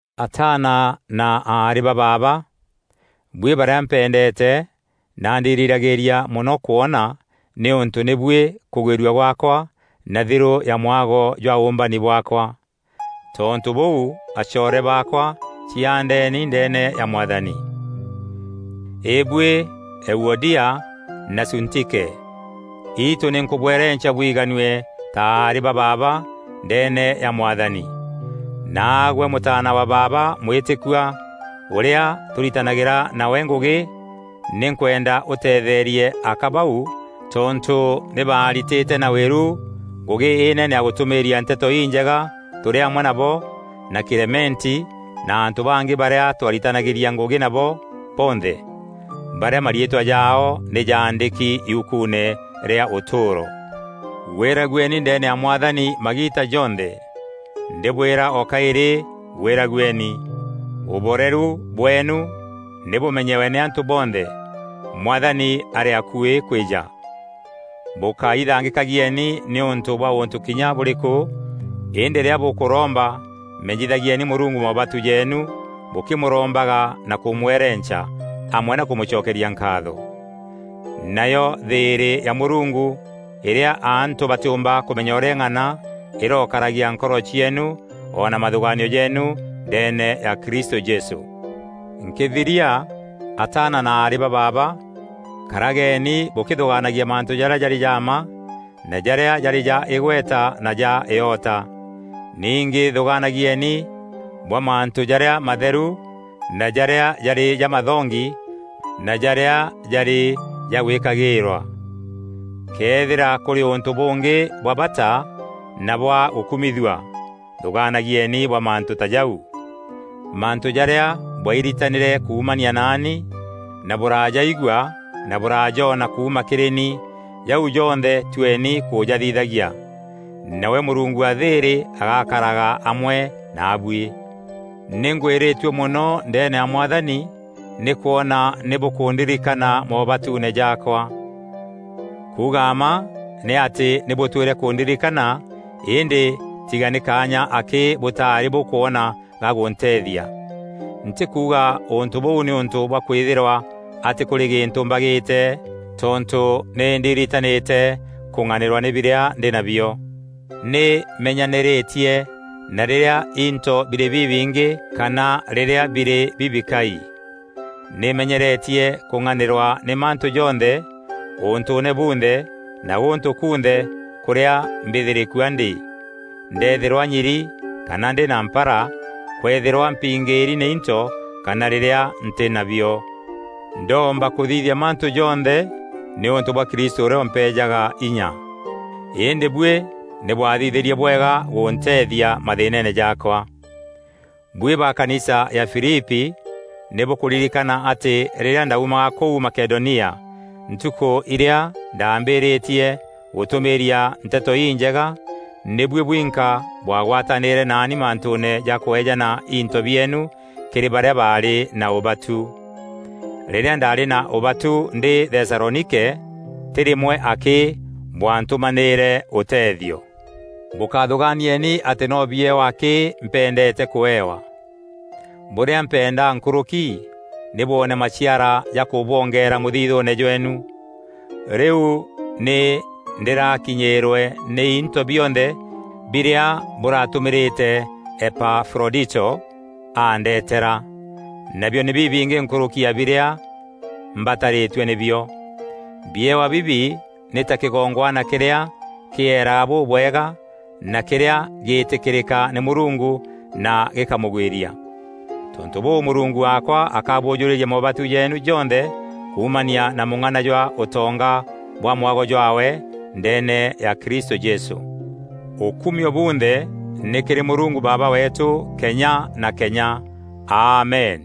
Ataana na aarî ba baaba, buî barîa mpendeete na ndirîragîîria mono kwona nîûntû nî buî kûgwîrua gwaakwa na thirû ya mwago jwa ûûmbani bwaakwa. Tontû bûu, acoore baakwa ciaandeni ndeene ya Mwathani. Îbuî Euodia na Suntike: Itû nî nkubwerenca bwiganue ta aarî ba baaba, ndeene ya Mwathani. Naagwe mûtaana wa baaba mwîtîkua ûrîa tûritanagîra nawe ngûgî, nî nkwenda ûteetheerie aka bau, tontû nî baaritîte na wîru ngûgî înene ya gûtûmîîria Nteto Injega tûrî amwe nabo na Kîlementi na antû bangî barîa twaritanagîria ngûgî nabo bonthe, barîa mariîtwa jaao nî jaandîki yukuune rîa ûtûûro. Gwîragueni ndeene ya Mwathani magiita jonthe! Ndîbwîra o kaîrî gwîragueni! Ûboreru bweenu nî bûmenyewe nî antû bonthe. Mwathani arî akuî kwîja. Bûkaithangîkagieni nîûntû bwa ûntû kinya bûrîkû, îndî rîrîa bûkûromba menyithagieni Mûrungu moobatu jeenu, bûkîmûrombaga na kûmwerenca, amwe na kûmûcokeria nkaatho. Nayo thîîrî ya Mûrungu îrîa antû batîûmba kûmenya ûrîa îng'ana, îrokaragia nkoro cieenu, o na mathûgaanio jeenu ndeene ya Kristû Jesû. Nkîthiria, ataana na aarî ba baaba, karageni bûkîthûgaanagia mantû jarîa jarî ja mma na jarîa jarî ja îgweta na ja îota. Ningî thûgaanagieni bwa mantû jarîa matheru na jarîa jarî jamathongi na jarîa jarî ja gwîkagîîrwa. Këethîra kûrî ûntû bûngî bwa bata na bwa gûkumithua, thûgaanagieni bwa mantû ta jau. Mantû jarîa bwairitanîre kuumania naani na bûrajaigua na bûrajoona kuuma kîrî ni, jau jonthe tueni kûjathithagia. Nawe Mûrungu wa thîîrî agakaraga amwe naabuî. Nî ngwîrîtue mono ndeene ya Mwathani nî kwona nî bûkûndirikana moobatuune jaakwa. Kuuga mma nî atî nî bûtwîre kûndirikana îndî tiga nî kaanya akî bûtaarî bûkwona ga gûnteethia. Ntîkuuga ûntû bûu nîûntû bwa kwîthîrwa atî kûrî gîntû mbagîte tontû nî ndiiritanîte kung'anîrwa nî birîa ndî nabio. Nî menyanîrîtie na rîrîa into birî bibingî kana rîrîa birî bibikai. Nî menyeretie kûng'anîrwa nî mantû jonthe ûntûûne bunthe na gûntû kunthe kûrîa mbîthîrîkua ndî; ndeethîrwa nyiri kana ndî na mpara; kwëethîrwa mpingîîri nî into kana rîrîa ntî na bio. Ndoomba kûthithia mantû jonthe nîûntû bwa Kristû ûrîa ûmpeejaga inya. Îndî buî nî bwathithîrie bwega gûnteethia mathîînene jaakwa. Buî ba kanisa ya Filipi nî bûkûririkana atî rîrîa ndaumaga kûu Makedonia ntukû irîa ndaambîrîtie gûtûmîîria Nteto Injega, nî buî bwinka bwagatanîîre naani mantûûne ja kweejana into bieenu kîrî barîa baarî na ûbatu. Rîrîa ndaarî na ûbatu ndî Thesalonike, tî rîmwe akî bwantûmanîîre ûteethio. Bûkathûgaanieni atî no biewa akî mpendeete kûewa; bûrîa mpenda nkûrûki nî bwoone maciara ja kûbwongeera mûthithûûne jweenu. Rîu nî ndîrakinyîîrwe nî into bionthe birîa bûratûmîrîte Epafrodito aandeetera. Nabio nî bibingî nkûrûki ya birîa mbatarîtue nî bio. Biewa bibi nî ta kîgongwana kîrîa kîeeraga bûbwega na kîrîa gîîtîkîrîka nî Mûrungu na gîkamûgwîria. Tontû bûû Mûrungu waakwa akabûjûrîria moobatu jeenu jonthe kuumania na mûng'ana jwa ûtonga bwa mwago jwaawe ndeene ya Kristû Jesû. Ûkumio bunthe nî kîrî Mûrungu Baaba weetû kenya na kenya! Amen!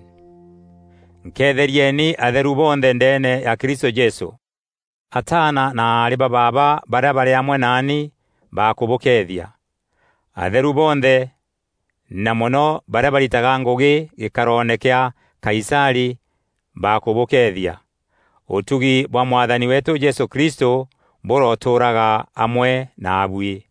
Nketherieni atheru bonthe ndeene ya Kristû Jesû. Ataana na aarî ba baaba barîa barî amwe naani bakûbûkeethia. Atheru bonthe na mono barîa baritaga ngûgî gîkaroone kîa Kaisarî bakûbûkeethia. Ûtugi bwa Mwathani weetû Jesû Kristû bûrotûûraga amwe naabuî.